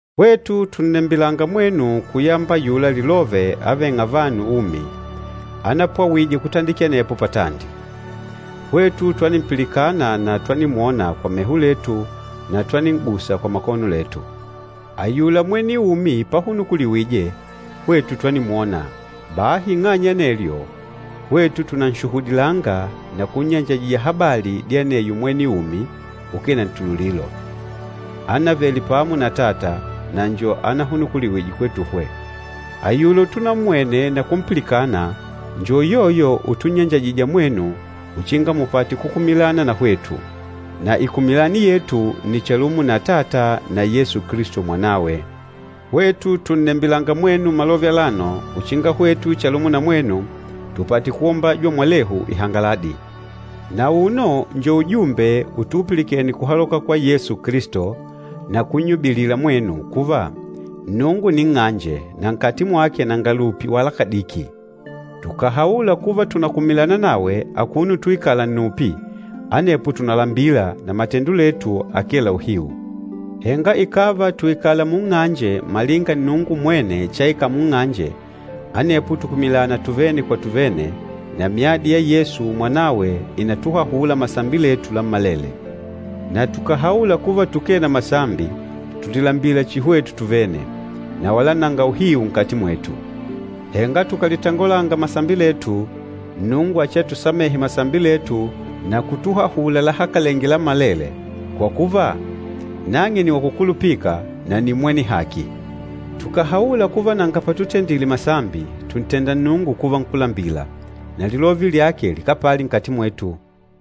Hwetu tùnnembilanga mwenu kuyamba ayula Lilove avêng'a vanu umi, anapwawije kutandikila anepo patandi. Hwetu twanimpilikana na twanimwona kwa meho letu na twanin'gusa kwa makono letu. Ayula mwene umi pahunukuliwije, hwetu twanimwona. Bahi ing'anya ya anelyo, hwetu tunanshuhudilanga na kunnyanjajija habali dya aneyo mwene umi ukee na ntululilo, ánavele pamo na Atata, na njo ahunukuliwîje kwetuhwe. Ayula utummwene na kumpilikana njo uyoyo utunnyanjajija mwenu uchinga mupate kukumilana na hwetu. Na ikumilani yetu nni chalumo na Atata na Yesu Kilisto Mwanawe. Hwetu tùnnembilanga mwenu malove alano uchinga hwetu chalumo na mwenu tupate kuombajwa mwalehu ihangaladi. Na auno njo ujumbe utuupilikene kuhaloka kwa Yesu Kilisto na kunnyubilila mwenu kuva, Nnungu nni nng'anje na nkati mwake nanga lupi wala kadiki. Tukàhaula kuva tùnakumilana nawe akuno utuikala nnupi, anepo tùnalambila na matendo letu akee la uhiu. Henga ikàva tùikala munng'anje malinga Nnungu mwene chaikala munng'anje, anepo tùkumilana tuvene kwa tuvene, na myadi ya Yesu Mwanawe ìnatuhahula masambi letu lammalele. Na tukàhaula kuva tukee na masambi, tùlilambila chihi hwetu tuvene, na wala nanga uhiu nkati mwetu. Henga tukàlitangolanga masambi letu, Nnungu achiatusamehe masambi letu na kutuhahula lahakalenge lammalele, kwa kuva, nang'e nni wakukulupika na nni mwene haki. Tukàhaula kuva nanga patutendile masambi, tùntenda Nnungu kuva nkúlambila, na lilove lyake likapali nkati mwetu.